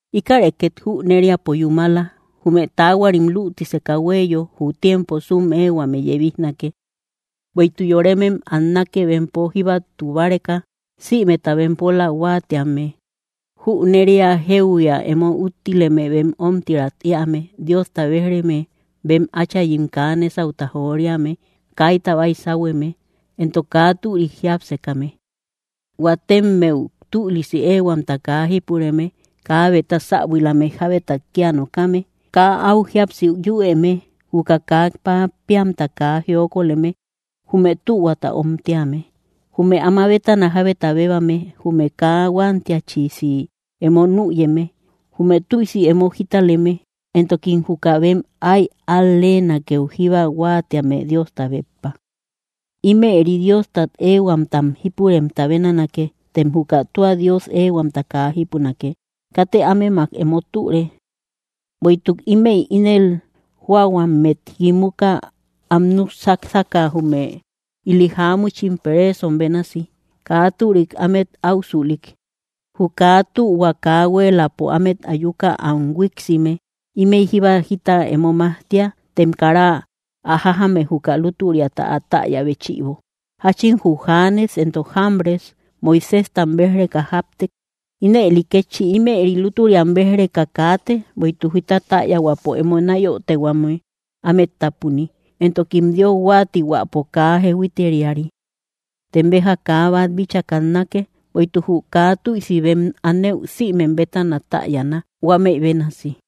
Íkäre két jüneriapo yúmala: Jume taahuarim lütiseka huéeyo, jü tiempo súm éehuame yebijnake. Bueïtuk yoremem annake, bempo jíbatu báreka, sïmeta bempola huáatíame, junneria jéuhuia emo úttileme, bem ómtirat éame, Diosta béj‑reme, bem áchayim kaa nésauta joriame, kaita baysahueme, entok kaa türik jiápsekame; huatemmeu tülisi éehuamta kaa jípureme, kabeta säbuilame, jábetat kía nokame, kaa áu jíapsi yüeme, juka kaa pappeamta kaa jiokoleme, jume tühuata omtíame, jume ama bétana jábeta bébame, jume kaa huantiachisi emo nüyeme, jume tüisi emo jítaleme, entokim juka bem áy al-leenakeu jíba huáatíame, Diosta béppa. Ímëri Diostat éehuamtam jípuremta bénanake, tem juka tua Dios éehuamta kaa jípunake. Katë ámemak emo türe. Bueïtuk ímëi ínel jóahuammet kimuka, am núk sásaka, jume ili jáamuchim, pereesom bénasi, kaa türik ámet áusülik. Jü kaa tühua kaa huéeläpo ámet ayuka am huíiksime. Ímëi jíba jita emo majtia, tem kara ä jájame, juka lútüriata, ä täya béchïbo. Jáchin jü Janes entok Jambres Moiséjtam béj‑reka jáptek, ínëli kétchi, ímëri lútüriatam béj‑reka kaate; bueïtuk jita täyahuäpo emo náyotehuame ámet tápuni, entokim Dios huáatihuäpo kaa jehuiteriari. Tem béja kaa bát bíchaa kannake; bueïtuk jü kaa tüisi bem anëu sïmem bétana täyana, huámëi bénasi.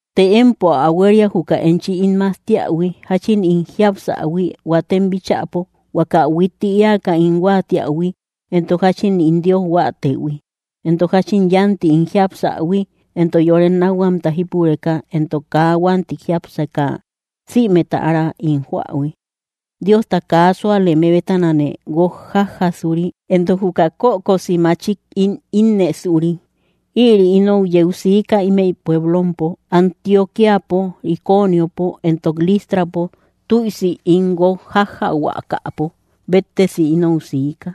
Të empo ä huéria, juka enchi ín majtiähui, jáchin ín jiapsähui huatem bíchäpo, huaka huitti éaka ín huáatiähui, entok jáchin ín Dios huáatëhui, entok jáchin yánti ín jiapsähui, entok yore nákhuamta jípureka, entok kaa huánti jiápseka sïmeta ára ín joähui, Diosta kaa súaleme bétanane guók jájjasuri, entok juka kökosi machik ín ínnësuri. Ïri inou yeu sika imey pueblompo Antioquíapo, Iconiopo, entok Listrapo; tüisi ín guók jájjahuakapo béttesi inou siika.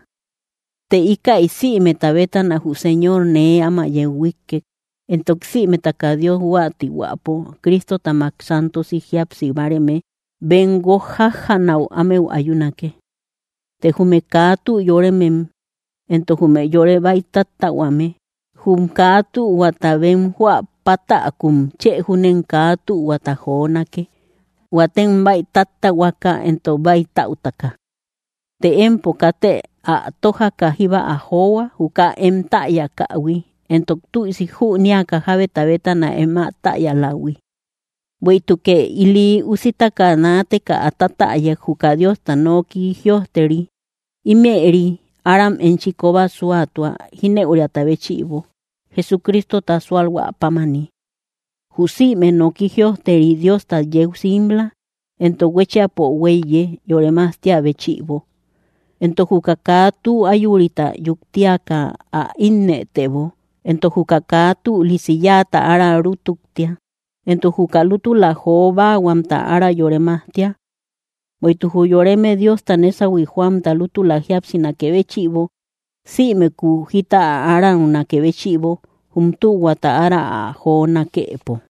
Të íkäi sïmeta bétana jü Señor nee áma yeu huíkkek. Entok sïmetaka Dios huáatihuäpo Cristotamak santosi jíapsi báareme bem guók jájjanäu ámeu ayunake. Të jume kaa tü yóremem entok jume yore bäi táttähuame, jum kaa tühuata bem joä pátäkum, chë júnem kaa tühuata jonake, huatem bäi táttähuaka, entok bäitaütaka. Të empo, kate ä tójaka jíba ä johua, juka em täyakähui, entok tüisi jünéaka jábeta bétana em ä täyalähui. Bueïtukë ili usitaka naateka ä tatäyak, juka Diosta noki jïojteri. Ímëri aram enchi kóba súatua, jínëuriata béchïbo, Jesucristota súalhuä pámani. Jü sïme noki jïojteri Diostat yeu simla, entok huéchiapo huéiye, yore majtia béchïbo; entok juka kaa tü ayurita yuktiaka ä ínnëtebo; entok juka kaa tülisi yáata ára rútuktia; entok juka lútula jo báahuamta ára yore majtia. Bueïtuk jü yoreme Diosta nésahui joamta lútula jíapsinakë béchïbo, simëku jita ä araunakë béchïbo, jum tühuata ára ä jonakëpo.